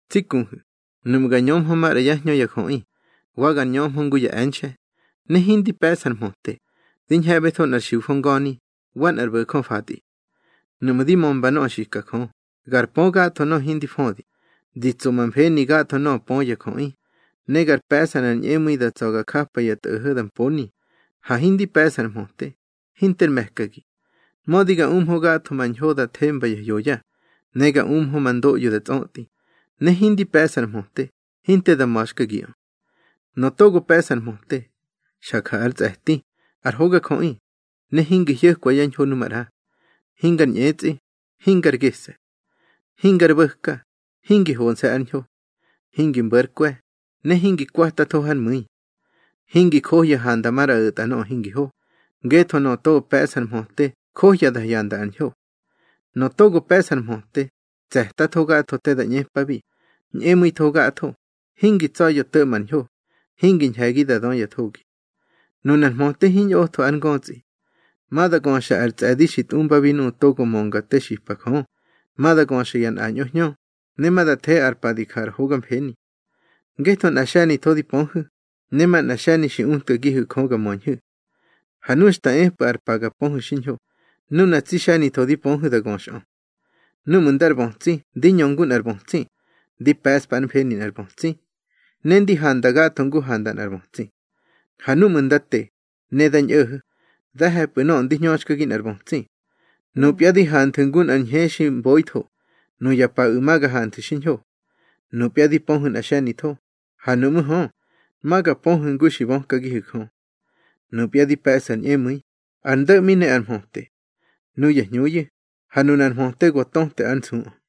Tsi kuhu̱, nuꞌmu̱ gar ñömhö maꞌra yá hñö ya jöꞌi, wa gar ñömhö ngu ya e̱nxe̱, ne hindi pe̱ꞌsa ar mhöte, di ñhe̱ꞌbetho nꞌar xiujö nga̱ni, wa nꞌar bo̱jö fatꞌi. Nuꞌmu̱ di mömba nöꞌö xika Jö, gar pö gatho nöꞌö hindi födi, di tso ma mfeni gatho nöꞌö pö ya jöꞌi, ne gar pe̱ꞌsa nꞌar ñꞌemu̱i da tsa̱ ga japa ya tꞌo̱ho̱ da mponi, ha hindi pe̱ꞌsa ar mhöte, hinter me̱kagi. Mödi ga umhö gatho ma ñho da themba ya hyoya, ne ga umhö ma ndoꞌyo da tsꞌötꞌi, ne hindi pe̱ꞌsa ar mhöte, hinte da ma̱xkagiꞌö. Nöꞌö togo pe̱ꞌsa ar mhöte, xa ja ár tsꞌe̱ti, ar hogajöꞌi, ne hingi hyo̱kwa yá ñho nu maꞌra. Hingar ñꞌetsꞌi, hingar gese̱. Hingar bo̱ka, hingi honse̱ ár ñho. Hingi mbo̱ ár kwe̱, ne hingi kwatatho hár mu̱i. Hingi johya handa maꞌra o̱tꞌa nöꞌö hingi ho, ngetho nöꞌö togo pe̱ꞌsa ar mhöte johya da hyanda ar ñho. Nöꞌö togo pe̱ꞌsa ar mhöte, tse̱tatho gatho te da ꞌñepabi, ñꞌemu̱itho gatho, hingi tsa̱ya̱ to̱ꞌma ar ñho, hingi ñhe̱gi da dö ya thogi. Nunar mhöte hiñꞌotho ár ngötsꞌi. Ma da göxa ar tsꞌe̱di xi tꞌumbabi nuꞌu̱ togo mönga te xipa Jö, ma da göxa ya nꞌañꞌo hñö, ne ma da the ar pa di ja ar hoga mfeni. Ngetho nꞌa xe̱nitho di pöhu̱, ne manꞌa xe̱ni xi utkagihu̱ Jö ga möñhu̱. Ha nu xta epꞌu̱ ar pa ga pöhu̱ xiñho, nuna tsi xe̱nitho di pöhu̱ da göxꞌö. Núꞌmu̱ ndar bötsi ndi ñö ngu nꞌar bötsi, ndi pe̱ꞌspa ár mfeni nꞌar bötsi, ne ndi handa gatho ngu handa nꞌar bötsi. Ha núꞌmu̱ nda te, ne da ñꞌo̱ho̱, da he̱pꞌu̱ nöꞌö ndi hñöxkagi nꞌar bötsi. Nupya di hanthu̱ ngu nꞌar ñhe xi mboitho; nuya paꞌu̱ ma ga hanthu̱ xiñho. Nupya di pöhu̱ nꞌa xe̱nitho, ha nuꞌmú̱ hö, ma ga pöhu̱ ngu xi bökagihu̱ Jö. Nupya di pe̱ꞌsu̱ ar ñꞌemu̱i, ar ndo̱ꞌmi ne ar mhöte, nuya hñuyu̱, ha nunar mhöte go töte ár nsuꞌö.